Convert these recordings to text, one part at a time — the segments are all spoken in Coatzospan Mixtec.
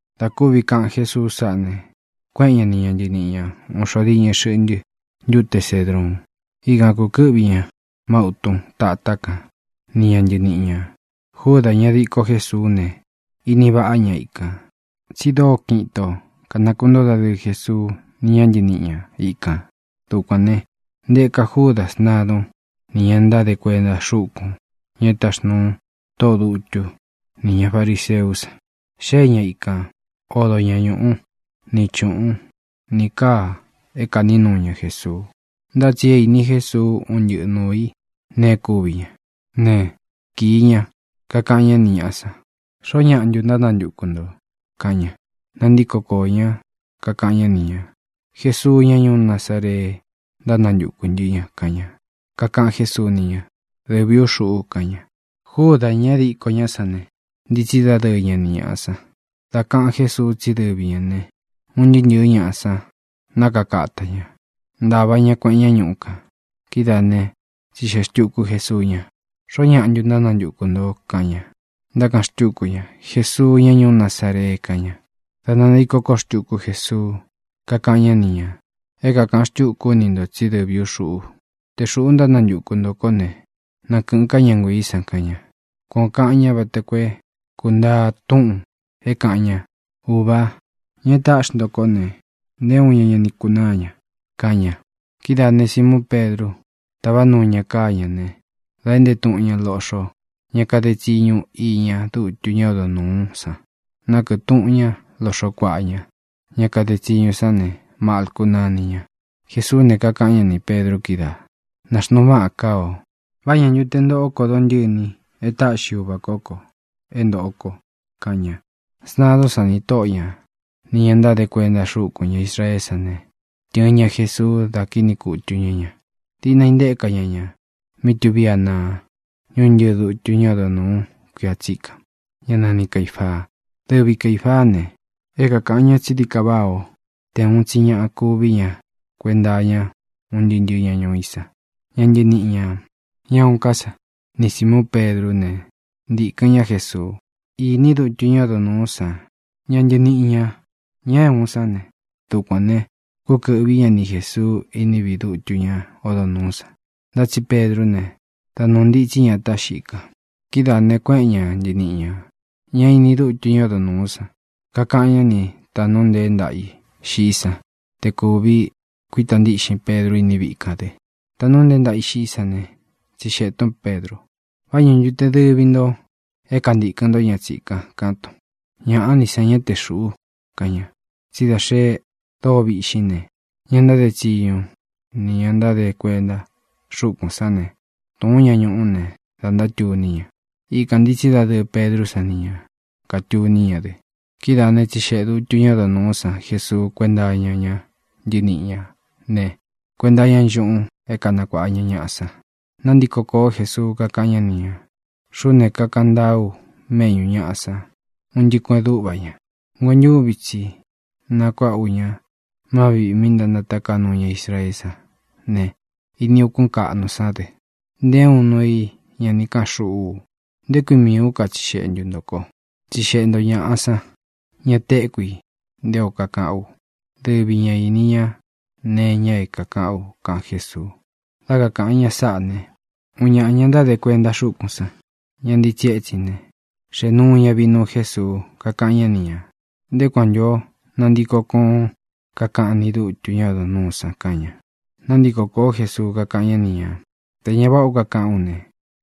Dā kúvi kaꞌan Jésuu sáꞌa ne, kuéꞌen ña ni ña ntɨniꞌi ña ūun xo diñɨ xɨꞌntɨ ntúte Cedruun. Ikān kukɨ́ꞌvi ña má utun tatá kan ni ña ntɨniꞌi ñā. Júdā, ña diko Jésuú ne, ini vaꞌá ña ikān, tsi dóo kiꞌin ito kānakuntóo dadɨɨ Jesuu ni ña ntɨníꞌi ña ikān. Dukuān né, ntēka Júdā sntadun ni ña ntáde kuenta xúkūn, ña e táxnūu tóꞌō dutú nī ña fariseú san. Xée ña ikān, odo ña ñūꞌú, ni chūꞌun, ni káa é kāꞌní nuu ña Jesuu. Ntá tsi é īni Jésuu un ntɨ́ꞌɨ nūu i neé kuvi ña ne, kīi ña, kakaꞌan ñá ni ñāꞌa san: —¿Xoó ñaꞌa ntu ntánantuku ntō? —kaꞌan ña. Nantíko koō ñá, kakaꞌan ñá ni ñā: —Jesuu, ñá ñuú Nazaree ntánantukū ntɨ́ ña —kaꞌan ña. Kakaꞌan Jésuu ni ña: —Dɨvī ú xuꞌu —kaꞌan ña. Júdā, ña é diko ñá san ne, ntitsí dadɨɨ ña ni ñāꞌa san. Dā kaꞌan Jésuu tsí dɨvi ñā ne, un ntɨɨ́ ntɨ̄ɨ́ ñaꞌa san nákaka ata ñā; ntāva ña kueꞌen ñá ñuꞌu kān. Kidáa ne, tsixeꞌe xtūku Jesuu ña: —¿Xoó ñaꞌa ntu ntánantuku ntō? —kaꞌan ña. Ntákaꞌan xtúku ña: —Jesuu, ñá ñuú Nazaree —kaꞌan ña. Dā nantiko koó xtuku Jesuu, kakáꞌan ñá ni ñā: —É kākaꞌan xtúku ú ni ntō tsí dɨvī ú xuꞌu. Te xūꞌú ntánantuku ntō kó ne, na kɨ̄ꞌɨn ká ña nguiī san —kaꞌan ña. Kuan ō kaꞌan ñá vata koo é kūntaa túꞌūn é kāꞌan ña: “Ūvá, ña e táꞌxi nto kó ne, nté uun ña ña ni kunáa ña”, kaꞌan ña. Kidáā ne, Simuun Pedru táva nuu ña káa ñā né, dā éꞌnte tuꞌun ña loꞌxo ña káde tsiñu iña dútu ñá odo nūú san; nákɨꞌɨ tūꞌun ñá loꞌxo kuaꞌa ña. Ña kade tsiñu sán ne, Malcu náni ña. Jesuú ne, kakaꞌan ñá nī Pedru kídaā: —Nāxnuu váꞌan káa ō. ¿Vá ñā ntu te ntoꞌó ko dontɨ̂ni é taꞌxi Uvā kó ko é ntōꞌo ko? —kaꞌan ña. Sntadún san, nī tóꞌo ña, nī ña ntáde kuenta xúkūn ña Israeé san ne, tɨ̄ɨn ña Jesuu, da kíꞌni kutu ñá ña. Diꞌna intéka ña ña mí tuví Anaa, ñuntɨ́ɨ dūtu ñá odo nūú kuia tsikan, ñá nani Caīfaa. Dɨvi Caīfaá ne, é kākaꞌan ñá tsi dií ka váꞌā ó te ūun tsi ñaꞌa kuví ña kuenta iña un ntɨɨ́ ntɨ̄ɨ́ ña ñuu í san. Ña ntɨniꞌi ñā, ña uun ká san, ni Sīmuun Pedrú ne, ntīkɨn ñá Jesuu. Ini dútu ñá odo nūú san ña ntɨniꞌi ñā, ña é uun sán ne, dukuān ne, kúkɨ̄ꞌví ña ni Jēsuu iní viꞌi dutu ñá odo nūú san. Ntá tsi Pedrú ne, da nuū ntitsí ña atá xiꞌi kan. Kidáā ne, kuéꞌen ña ntɨniꞌi ñā, ñá ini dútu ñá odo nūú san, kakaꞌan ñá ni tāꞌnu nteé ntaꞌa i xiꞌí san te kūvi kuíta ntíꞌxin Pedru iní viꞌi kān dɨ. Taꞌnu nteé ntaꞌa ī xiꞌí san ne, tsixeꞌē tún Pedru: —¿Vá ña ntu te dɨvi ntō é kantīkɨn ntó ña tsikan? —kaꞌán tun. —Ñaꞌa ní san, ñá te xūꞌu —kaꞌan ña. Tsí da xe dóo viꞌxín ne, ña ntáde tsiñu nī ña ntáde kuenta xúkūn sán ne, tūún ña ñuꞌú ne, dā ntátuní ña. Ikān ntitsí dadɨɨ Pedrú san ni ñā, katuní ña dɨ. Kidáā né, tsixeꞌe dūtu ñá odo nūú san Jesuu kuénta iña ñá ntɨniꞌi ñā ne, kuenta iña nchúꞌūn é kanakuāꞌa ña ñaꞌa san. Nantíko kōó Jesuu, kakáꞌan ñá ni ñā: —Xuꞌú ne, kakaꞌan ntaá u méꞌñū ñaꞌa san un ntɨꞌɨ kueꞌen dúꞌva ña. Nguentúvi tsi nakuāꞌá u ña má viꞌī mí ntánataká nuu ña Israeé san ne, ini ukún kaꞌnu sán dɨ. Nté uun nuu i ña ni káꞌan xuꞌú u. ¿Nté kui miī ú katsixeꞌe ntu ntō ko? Tsixeꞌe nto ñāꞌa san, ña téku i nté o kakaꞌán u. Dɨvi ña īni ña nee iña é kākaꞌán u —kaꞌan Jésuu. Dá kakāꞌan ña sáꞌa ne, uun ñaꞌa ña ntáde kuenta xúkūn sán, ña ntitsí etsin ne, xēꞌe nuu ña vinuu Jesuu, kakáꞌan ñá ni ñā: —¿Nté kui kuan ntū ó kanantiko kōón kakaꞌan ni dútu ñá odo nūú san? —kaꞌan ña. Nantíko kōó Jesuu, kakáꞌan ñá ni ñā: —Tē ña váꞌa o kakaꞌán u ne,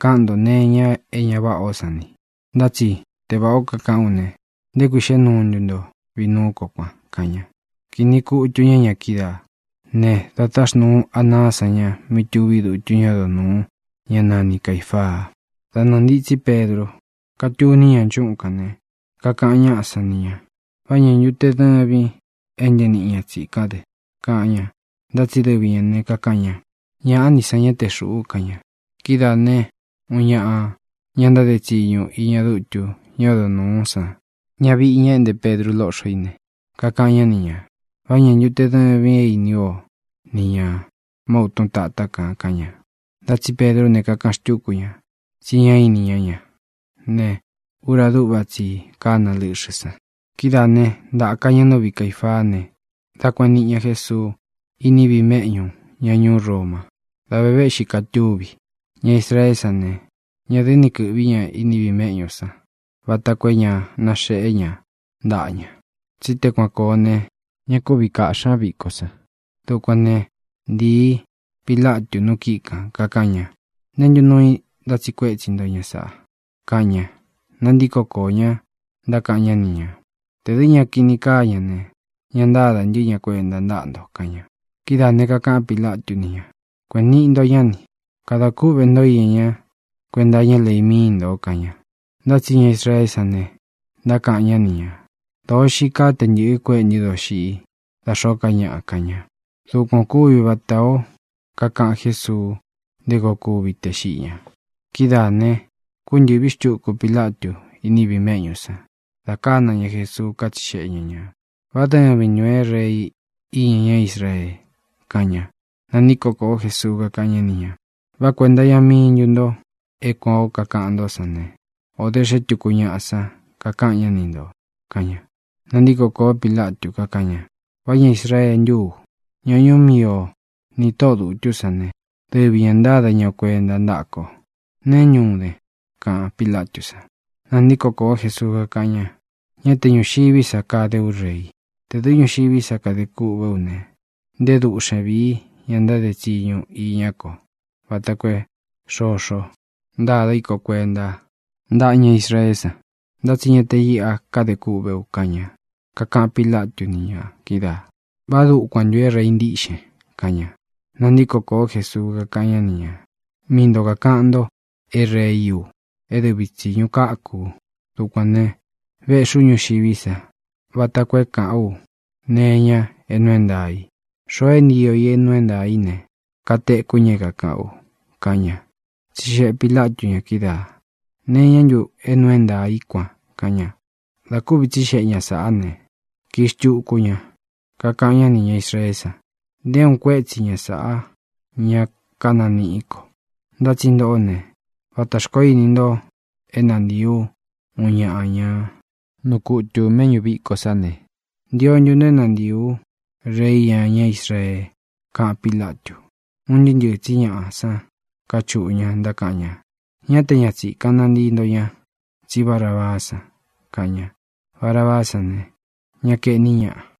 káꞌan nto nee iña é ña váꞌā ó san ni. Ntá tsi te vāꞌá o kakaꞌán u ne, ¿nté kui xéꞌe nuu ntun vinuú ko kuan? —kaꞌan ña. Kīꞌni kutu ña ña kídaā né, dā táxnūu Anaá san ña mí tuví dutu ñá odo nūu, ñá nani Caīfaa. Da nɨɨ̄ ntitsí Pedru, katúni ña nchúꞌun kān ne, kakaꞌan ñáꞌa san ni ñā: —¿Vá ña ntu te dɨvīn é ntɨniꞌin ña tsīkán dɨ? —kaꞌan ña. Ntá tsi dɨvi ñā ne, kakaꞌan ña: —Ñaꞌá ni san, ñá te xūꞌu —kaꞌan ña. Kidáa ne, uun ñaꞌa ña ntáde tsiñu iña dútu ñá odo nūú san, ñaviꞌi ña e éꞌnte Pedru lóꞌxo í ne, kakaꞌan ñá ni ñā: —¿Vá ña ntu te dɨvīn é ini ú o ni ñā má utun tatá kān? —kaꞌan ña. Ntá tsi Pedrú ne, kakaꞌan xtúku ña tsi ñá ini ñá ña ne, ura dúꞌva tsi i kána lɨ́ꞌxɨ̄ san. Kidáā né, ntāka ña nú viꞌi Caīfaá ne, dā kueniꞌi ña Jésuu iní viꞌi mēꞌñú ña ñuú Roma. Dā ve véꞌxi katúvi. Ña Israeé san ne, ña dɨ́ ni kɨ̄ꞌví ña iní viꞌi meꞌñú san vata koo é ña naxeꞌé ña ntaꞌa ña. Tsí te kuan kōo ne, ña kúvi kāꞌxí ña viko san. Dukuān né, ntīi Pilatu nu kíꞌi kān, kakaꞌan ña: —¿Neē ntú nuu i ntátsiꞌi kuétsi nto ña sāꞌa? —kaꞌan ña. Nantíko koō ñá, ntákaꞌan ñá ni ñā: —Tē dɨ́ ña kini kaa ña ne, ña ntádā ntɨ́ ña kuenta ntáꞌa nto —kaꞌan ña. Kidáā ne, kakaꞌan Pílatu ni ña: —Kueꞌēn niꞌi nto ñá ni. Kada kúꞌvē ntó iña ñá kuenta iñá lei míi ntō —kaꞌan ña. Ntá tsi ña Israeé san ne, ntákaꞌan ñá ni ñā: —Dōo xii kaá te ntɨ̄ꞌɨ kuéꞌe ntɨ doxiꞌi dā xóo ká ñaꞌa —kaꞌan ña. Dukuan ō kúvi vatā ó kakaꞌan Jésuu nté koo kúvi tē xiꞌi ña. Kidáā ne, kúntɨ̄ꞌví xtuku Pilatu iní viꞌi mēꞌñú san, dā kána ña Jesuu, kátsixeꞌe ña ñā: —¿Vá dɨvin ntūn é Rei iña ñá Israee? —kaꞌan ña. Nantíko kōó Jesuu, kakáꞌan ñá ni ñā: —¿Vá kuēnta iña mii ntú nto é kuān ó kakaꞌan ntó san ne, o dē xé tuku ñaꞌa san kakaꞌan ñá ni ntō? —kaꞌan ña. Nantíko kōó Pilatu, kakáꞌan ña: —¿Vá ña Israee ntú u? Ña ñuú mii o nī tóꞌō dutú san ne, dɨvi ñā ntáda ña o kuenta ntáꞌa ko. ¿Neé ntu den? —kaꞌan Pilatú san. Nantíko kōó Jesuu, kakáꞌan ña: —Ñá te ñūxiví sa kade ú rei. Tē dɨ́ ñuxiví sa kade kûꞌvé u ne, nté duꞌxen vīí ña ntáde tsiñu iñá ko vata koo é xoxo ntada í ko kuenta ntáꞌa ña Israeé san; ntá tsi ña te iꞌa káde kûꞌvé u —kaꞌan ña. Kakaꞌan Pílatu ni ña kídaā: —¿Vá dukuan ntū é rei ntíꞌxen? —kaꞌan ña. Nantíko kōó Jesuu, kakáꞌan ñá ni ñā: —Mii nto kākaꞌan nto é reí u. E dɨvi tsiñu káku u. Dukuān ne, véꞌxī ú ñuxiví sa vata koo é kāꞌán u nee iña é nuu é ntaā i. Xoo é ntio i é nuu é ntaā í ne, katekú ña é kākaꞌán u —kaꞌan ña. Tsixeꞌe Pīlatu ña kídaā: —¿Nee iñá ntu é nuu é ntaā í kuan? —kaꞌan ña. Dā kúvi tsixeꞌe ña sāꞌá ne, kii xtuku ña, kakaꞌan ñá nī ña Israeé san: —Nté uun kuétsi ña sāꞌá ña kánaniꞌí ko. Ntá tsi ntoꞌó ne, vatā xkoó ini nto é nantiī ú uun ñaꞌa ña nuu kutū méꞌñū viko sá ne, ¿ntio ntu nto é nantiī ú Rei iña ñá Israee? —kaꞌan Pílatu. Un ntɨɨ́ ntɨɨ̄ tsí ñaꞌa san káchuꞌu ña, ntákaꞌan ña: —¡Ñá te ña tsīkan nantii ntó ña, tsí Barabaá san! —kaꞌan ña. Barabaá san ne, ña kaeꞌní ñaꞌa.